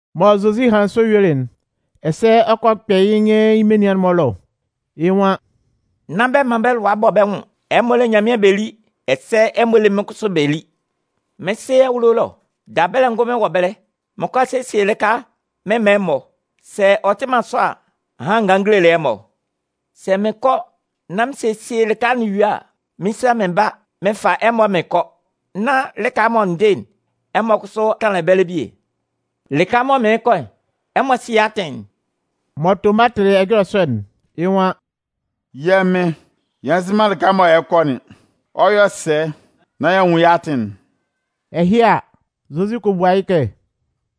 Mɔ Zozi hanlɩn sɔ yuelɩ'n, ɛsɛ ɔ kɔ kpɛ yɩ́ nyɩn yɩ́ menian'n-mɔ ɛlɔ, yɩ́ nwan: “Nán bɛ man bɛ́ lʋa bɔ bɛ́ nwʋn, ɛmɔ lé Nyanmɩan bɛ lí, ɛsɛ ɛmɔ lé mɩ́n kʋsʋ bɛ lí. Mɩ́n Sɩ awulo ɛlɔ, dabɛlɛ ngʋnmɩn wɔ ɛbɛlɛ. Mɩn 'kɔ a sesie lɩka mɩn man ɛmɔ. Sɛ ɔ tɩ man sɔ a, ahan n ganlɩn n gelelɩ ɛmɔ. Sɛ mɩn kɔ nán mɩn sesie lɩka'n yue a, mɩn 'sa mɩn ba, mɩn fa ɛmɔ mɩn kɔ, nán lɩka mɔ n dɩ'n, ɛmɔ kʋsʋ tanlan ɛbɛlɛ bie. Lɩka mɔ mɩɩn kɔ'n, ɛmɔ sɩ yɩ́ atɩn'n.” Mɔ Toma tɩlɩ ɛjɔlɛ sɔ'n, yɩ́ nwan: “Yɛ́ Mɩn, yɛ nzɩ man lɩka mɔ ɛ lɛ kɔ'n, ɔ 'yɔ sɛ nán y'a nwun yɩ́ atɩn'n?” Ɛhɩ a, Zozi kɔ bua yɩ́ kɛ: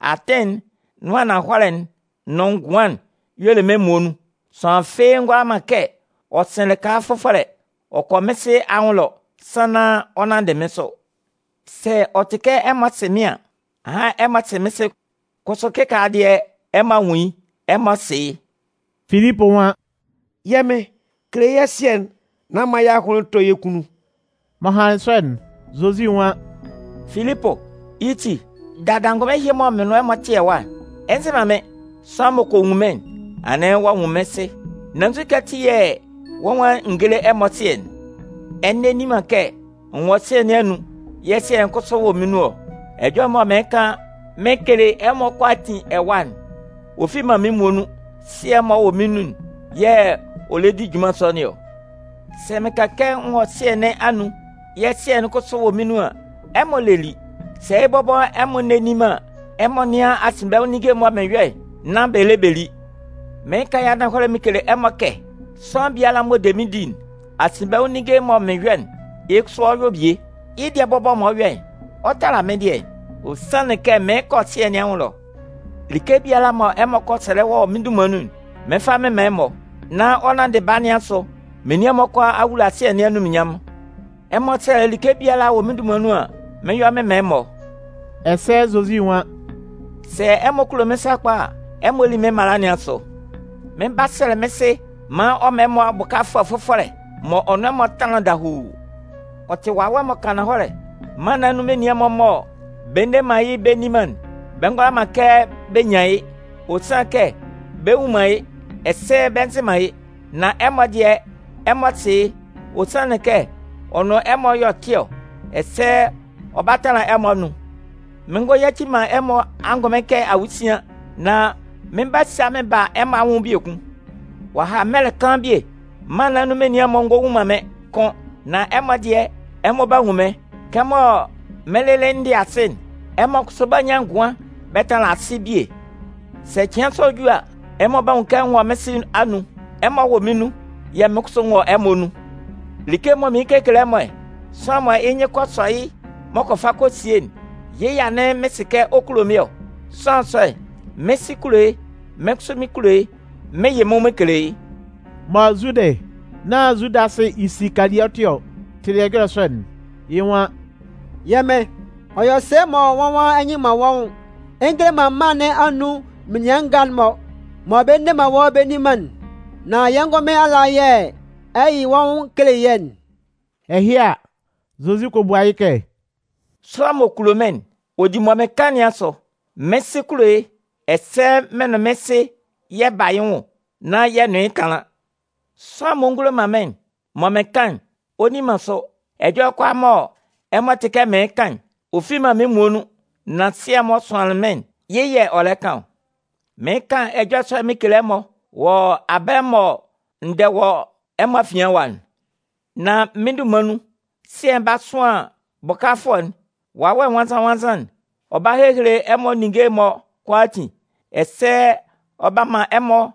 “Atɩn'n, nʋn ananhɔlɛ'n nʋn ngʋan'n y'ɔ le mɩ́n muonun. Sʋanlan fɩ́ɩ́ ngʋala man kɛ ɔ sɩn lɩka fʋfɔlɛ ɔ kɔ mɩ́n Sɩ anwʋn ɛlɔ sannan ɔ 'nanndɩ mɩ́n sʋ. Sɛ ɔ tɩ kɛ ɛmɔ sɩ mɩ́n an, ahan ɛmɔ 'sɩ mɩ́n Sɩ. Kʋsʋ kɩkaala dɩɛ, ɛmɔ a nwun yɩ́, ɛmɔ sɩ yɩ́.” Filipʋ nwan: “Yɛ́ Mɩn, kele yɛ́ Sɩɛ'n nán man yɛ́ ahʋnlɩn tɔ́ yɛ́ kunnun.” M'ɔ hanlɩn sɔ'n, Zozi nwan: “Filipʋ, yɩ́ ti, dada angʋnmɩn ɛhɩ mɔ mɩn nʋn ɛmɔ tɩ ɛwa'n, ɛ nzɩ man mɩ́n? Sʋanlan m'ɔ kɔ nwun mɩ́n'n, anɩn ɔ'a nwun mɩ́n Sɩ, nan nzukɛ ati yɛ̂ wɔ́ nwan n géle ɛmɔ Sɩɛ'n? Ɛ nne nni man kɛ n wɔ Sɩɛ nɩn anun yɛ̂ Sɩɛ'n kʋsʋ wɔ mɩ́n nun ɔ? Ɛjɔlɛ'n mɔ mɩɩn kan mɩn kele ɛmɔ kʋalaatin ɛwa'n, ɔ fi man mɩ́n muonun. Sɩɛ'n m'ɔ wɔ mɩ́n nun'n yɛ̂ ɔ lɛ di junman sɔ nɩn ɔ. Sɛ mɩn kan kɛ n wɔ Sɩɛ nɩn anun yɛ̂ Sɩɛ'n kʋsʋ wɔ mɩ́n nun an, ɛmɔ lé lí. Sɛ yɩ́ bɔbɔ ɛmɔ nne nni man an, ɛmɔ nɩ́an asinbɛnwʋn ninnge'n mɔ mɩn yɔ'n nán bɛ lé bɛ lí. Mɩɩn kan yɩ́ ananhɔlɛ mɩn kele ɛmɔ kɛ sʋanlan biala m'ɔ de mɩ́n di'n, asinbɛnwʋn ninnge'n mɔ mɩn yɔ'n, yɩ́ kʋsʋ ɔ 'yɔ bie. Yɩ́ dɩɛ'n bɔbɔ mɔ ɔ 'yɔ'n, ɔ 'tala mɩ́n dɩɛ'n. Ɔ sanlɩn kɛ mɩɩn kɔ Sɩɛ nɩn anwʋn ɛlɔ. Like biala mɔ ɛmɔ kɔ sɛlɛ wɔ mɩ́n dunman nun'n, mɩn 'fa mɩn man ɛmɔ, nán ɔ nanndɩ Baa nɩn asʋ menian'n-mɔ kʋalaa a wula Sɩɛ nɩn anunminnyanmʋn. Ɛmɔ sɛlɛ like biala wɔ mɩ́n dunman nun an, mɩn 'yɔ mɩn man ɛmɔ.” Ɛsɛ Zozi Nwan: “Sɛ ɛmɔ kulo mɩ́n sakpa a, ɛmɔ lí mɩ́n mala nɩn asʋ. Mɩn 'ba sɛlɛ mɩ́n Sɩ maan ɔ man ɛmɔ Bʋkafʋɛ fʋfɔlɛ m'ɔ nʋn ɛmɔ 'tanlan dahuu. Ɔ tɩ Wawɛ m'ɔ kan ananhɔlɛ. Mân nɩn anun menian'n-mɔ mɔ bɛ nne man mɩ́n bɛ nni man'n, bɛ ngʋala man kɛ bɛ nyan yɩ́, ɔ sanlɩn kɛ bɛ nnwun man yɩ́, ɛsɛ bɛ nzɩ man yɩ́. Nan ɛmɔ dɩɛ, ɛmɔ sɩ yɩ́, ɔ sanlɩn kɛ ɔ nʋn ɛmɔ y'ɔ tɩ ɔ, ɛsɛ ɔ 'ba tanlan ɛmɔ anun. Mɩn ngɔ yaci man ɛmɔ angʋnmɩn kɛ awusian. Nan mɩn 'ba sa mɩn ba ɛmɔ anwʋn biekun. Ɔ'a ha mɛlɛ kaan bie, mân nɩn anun menian'n-mɔ ngɔ nwun man mɩ́n kʋ́n. Nan ɛmɔ dɩɛ, ɛmɔ 'ba nwun mɩ́n. Kɛmɔ mɩ́n lɩlɩ n dɩ asɩ'n, ɛmɔ kʋsʋ 'ba nyan ngʋan bɛ tanlan asɩ bie. Sɛ cɩan sɔ'n ju a, ɛmɔ 'ba nwun kɛ n wɔ mɩ́n Sɩ anun, ɛmɔ wɔ mɩ́n nun, yɛ̂ mɩ́n kʋsʋ n wɔ ɛmɔ anun. Like mɔ mɩn kekele ɛmɔ'n, sʋanlan mɔ yɩ́ nyɩn kɔ sɔ yɩ́ m'ɔ kɔ fa kɔ sie'n, yɩ́ yɛ̂ anɩn mɩn sɩ kɛ ɔ kulo mɩ́n ɔ. Sʋanlan sɔ'n, mɩ́n Sɩ 'kulo yɩ́, mɩ́n kʋsʋ mɩn 'kulo yɩ́, mɩn 'yɩ mɩ́n nwʋn mɩn kele yɩ́.” Mɔ Zudɩ (nán Zudasɩ Isikaliɔtɩ ɔ) tɩlɩ ɛjɔlɛ sɔ'n, yɩ́ nwan: “Yɛ́ Mɩn, ɔ yɔ sɛ mɔ wɔ́ nwan ɛ nyɩ man wɔ́ nwʋn ɛ ngele man mân nɩn anun menian nga'n-mɔ mɔ bɛ nne wɔ́ bɛ nni man'n, nan yɛ́ ngʋnmɩn ala yɛ̂ ɛ 'yɩ wɔ́ nwʋn kele yɛ́'n?” Ɛhɩ a, Zozi kɔ bua yɩ́ kɛ: “Sʋanlan m'ɔ kulo mɩ́n'n, ɔ di mɔ mɩn kan nɩn asʋ. Mɩn Sɩ 'kulo yɩ́, ɛsɛ mɩn nʋn mɩ́n Sɩ yɛ 'ba yɩ́ nwʋn nán yɛ nʋn yɩ́ tanlan. Sʋanlan m'ɔ ngulo man mɩ́n'n, mɔ mɩn kan'n, ɔ nni man sʋ. Ɛjɔlɛ kʋalaa mɔ ɛmɔ tɩ kɛ mɩɩn kan'n, ɔ fi man mɩ́n muonun, nan Sɩɛ'n m'ɔ sʋanlɩn mɩ́n'n, yɩ́ yɛ̂ ɔ lɛ kan ɔ. “Mɩɩn kan ɛjɔlɛ sɔ'n mɩn kele ɛmɔ wɔ abɛlɛ mɔ n dɛ wɔ ɛmɔ afian ɛwa'n. Nan mɩ́n dunman nun Sɩɛ'n 'ba sʋan Bʋkafʋɛ'n, Wawɛ Nwannzan-nwannzan'n. Ɔ 'ba hehele ɛmɔ ninnge'n-mɔ kʋalaatin ɛsɛ ɔ 'ba man ɛmɔ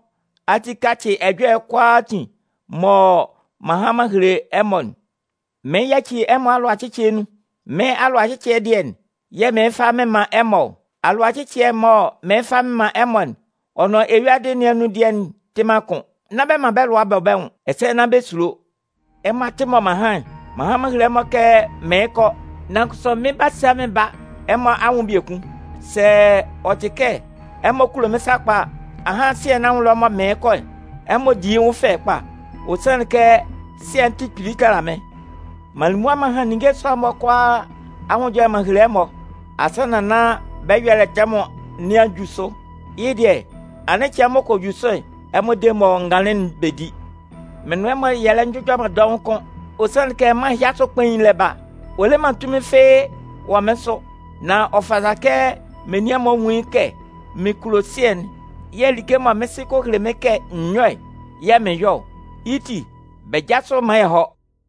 ati kacɩ ɛjɔlɛ'n kʋalaatin mɔ m'an han m'an hele ɛmɔ'n. Mɩɩn yaci ɛmɔ alʋacɩcɩɛ nun. Mɩ́n alʋacɩcɩɛ dɩɛ'n yɛ̂ mɩɩn fa mɩn man ɛmɔ ɔ. Alʋacɩcɩɛ'n mɔ mɩɩn fa mɩn man ɛmɔ'n, ɔ nʋn eyuadɩ nɩn anun dɩɛ'n tɩ man kʋ́n. Nán bɛ man bɛ́ lʋa bɔ bɛ́ nwʋn, ɛsɛ nán bɛ sulo. “Ɛmɔ a tɩ mɔ m'an han'n. M'an han m'an hele ɛmɔ kɛ mɩɩn kɔ, nan kʋsʋ mɩn 'ba sa mɩn ba ɛmɔ anwʋn biekun. Sɛ ɔ tɩ kɛ ɛmɔ kulo mɩ́n sakpa a, ahan Sɩɛ nɩn anwʋn ɛlɔ mɔ mɩɩn kɔ'n, ɛmɔ 'di yɩ́ nwʋn fɛ kpa. Ɔ sanlɩn kɛ Sɩɛ'n tɩ kpili tala mɩ́n. M'an li mʋa m'an han ninnge sɔ'n-mɔ kʋalaa anwʋn ɛjɔlɛ m'an hele ɛmɔ asannan nán bɛ́ ɛyɔlɛ tɛmʋn nɩn a ju sʋ. Yɩ́ dɩɛ, anɩn cɩan m'ɔ kɔ ju sʋ'n, ɛmɔ de mɔ n ganlɩn'n bɛ di. Mɩn nʋn ɛmɔ yɛ lɛ njʋjɔ man dɔʋn kʋ́n. Ɔ sanlɩn kɛ mân ɛhɩ asʋ kpain'n lɛ ba. Ɔ le man tunmin fɩ́ɩ́ wɔ mɩ́n sʋ. Nan ɔ fata kɛ menian'n-mɔ nwun yɩ́ kɛ mɩn kulo Sɩɛ'n yɛ̂ like mɔ mɩ́n Sɩ kɔ hele mɩ́n kɛ n yɔ́'n yɛ̂ mɩn yɔ ɔ. Yɩ́ ti, bɛ jásʋ maan yɛ hɔ́.”